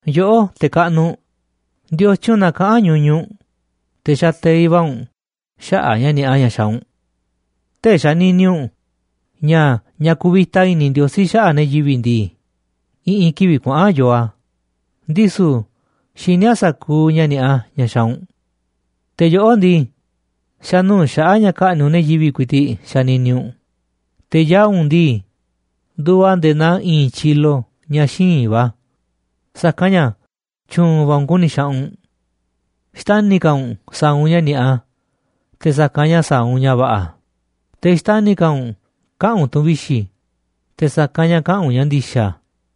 Yoꞌó, te̱ kaꞌnuꞌ, ¿ndiotyun na kaꞌán ñuñuꞌ u̱nꞌ, te̱ xateiꞌ va̱ u̱nꞌ xaꞌa̱ꞌ ña̱ ni̱a̱ꞌa ña̱ xaaꞌ u̱nꞌ? ¿Tee̱ꞌ xanini u̱nꞌ ña̱ ña̱ kuvita i̱ni̱ Ndiosí xaꞌa̱ꞌ ne̱ yivi̱ꞌ ndii, i̱ꞌi̱n kivi̱ꞌ kuaꞌa̱n yoo a̱, ndisu̱ xini a̱ sa̱kuuꞌ ña̱ ni̱a̱ꞌa ña̱ xaaꞌ u̱nꞌ? Te̱ yoꞌó ndii, xa̱nuu̱ꞌ xaꞌa̱ꞌ ña̱ ka̱ꞌni̱ꞌ u̱nꞌ ne̱ yivi̱ꞌ ku̱i̱ti̱ꞌ xanini u̱nꞌ, te̱ yaa̱ꞌ u̱nꞌ ndii, nduuꞌ a̱ nde̱e̱ naa i̱i̱n tyilo ña̱ xíinꞌ va̱, sa̱kanꞌ ña̱ tyu̱u̱n va̱ u̱nꞌ ku̱ni̱ xaꞌanꞌ u̱nꞌ. Xtani̱ ka̱ u̱nꞌ sa̱a̱ u̱nꞌ ña̱ ni̱a̱ꞌa te̱ sa̱kanꞌ ña̱ sa̱a̱ u̱nꞌ ña̱ va̱ꞌa̱, te̱ xtani̱ ka̱ u̱nꞌ kaꞌa̱n u̱nꞌ tu̱n vixi̱ te̱ sa̱kanꞌ ña̱ kaꞌa̱n u̱nꞌ ña̱ ndi̱xa̱.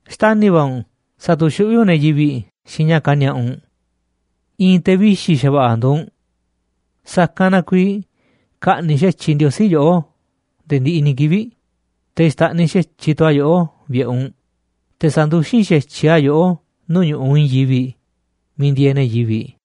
Xtani̱ va̱ u̱nꞌ sa̱tu̱xuꞌví u̱nꞌ ne̱ yivi̱ꞌ xiinꞌ ña̱ kani̱a̱ꞌa u̱nꞌ. I̱i̱n te̱ vixi̱ xa̱va̱ꞌa̱ nduuꞌ u̱nꞌ. Sa̱kanꞌ na kuiiꞌ ka̱ꞌni̱ꞌ xa̱tyiꞌ Ndiosí yoꞌó nde̱e̱ ndiꞌiꞌ ni̱ kivi̱ꞌ, te̱ xta̱ꞌniꞌ xa̱tyiꞌ tu̱ a̱ yoꞌó vi̱ꞌe̱ u̱nꞌ, te̱ sa̱nduxín xa̱tyiꞌ a̱ yoꞌó nuu̱ꞌ ñu̱ꞌuꞌ i̱i̱n yivi̱ꞌ miiꞌ ndieeꞌ ne̱ yivi̱ꞌ.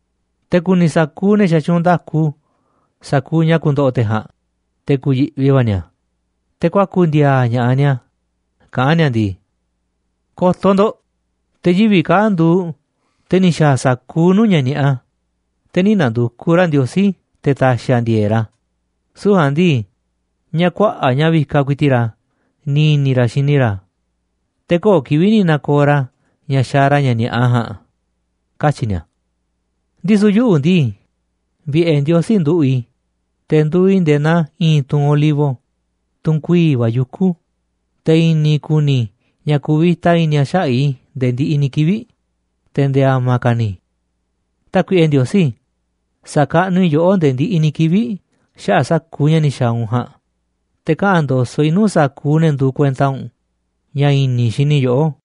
Te̱ ku̱ni̱ sa̱kuuꞌ ne̱ xatyuunꞌ nda̱ku sa̱kuuꞌ ña̱ ku̱ndo̱ꞌo̱ te̱ ja̱a̱nꞌ, te̱ ku̱yi̱ꞌvi va̱ ni̱a̱, te̱ kuaku̱ ndi̱a̱a̱ ña̱ꞌaꞌ ni̱a̱, kaꞌán ni̱a̱ ndii: “Ko̱to̱ ndo̱ꞌ, te̱ yivi̱ꞌ kaa̱ꞌ nduuꞌ te̱ ni̱ xa̱a̱ sa̱kuuꞌ nuu̱ꞌ ña̱ ni̱a̱ꞌa, te̱ nï̱ na̱ndu̱kuꞌ ra̱ Ndiosí te̱ ta̱xi̱ a̱ ndi̱e̱e̱ꞌ ra̱, süu̱ꞌ ja̱a̱nꞌ ndii, ña̱ kuaꞌa̱ꞌ ña̱ vikaꞌ ku̱i̱ti̱ꞌ ra̱ ni̱ i̱ni̱ ra̱ xini ra̱, te̱ köo̱ꞌ kivi̱ꞌ ni̱ na̱ko̱o̱ ra̱ ña̱ xaaꞌ ra̱ ña̱ ni̱a̱ꞌa ja̱a̱nꞌ”, katyi̱ ni̱a̱. Ndisu̱ yuꞌu̱ ndii, vi̱ꞌe̱ Ndiosí nduꞌu̱ꞌ i̱, te̱ nduuꞌ i̱ nde̱e̱ naa i̱i̱n tunꞌ olivo, tunꞌ kuii̱ꞌ va̱ yuku̱, te̱ i̱ni̱ ku̱ni̱ i̱ ña̱ kuvita i̱ni̱ a̱ xaꞌa̱ꞌ i̱ nde̱e̱ ndiꞌiꞌ ni̱ kivi̱ꞌ, te̱ nde̱e̱ a̱ma̱ ka̱ ni̱. Tákuiꞌe Ndiosí, sa̱kaꞌnuꞌ i̱ yoꞌó ndee ndiꞌiꞌ ni̱ kivi̱ꞌ xaꞌa̱ꞌ sa̱kuuꞌ ña̱ ni̱ xa̱a̱ u̱nꞌ ja̱a̱nꞌ, te̱ kaꞌa̱n ndo̱so̱ꞌ i̱ nuu̱ꞌ sa̱kuuꞌ ne̱ nduuꞌ kuenta u̱nꞌ ña̱ i̱ni̱ i̱ xini i̱ yoꞌó.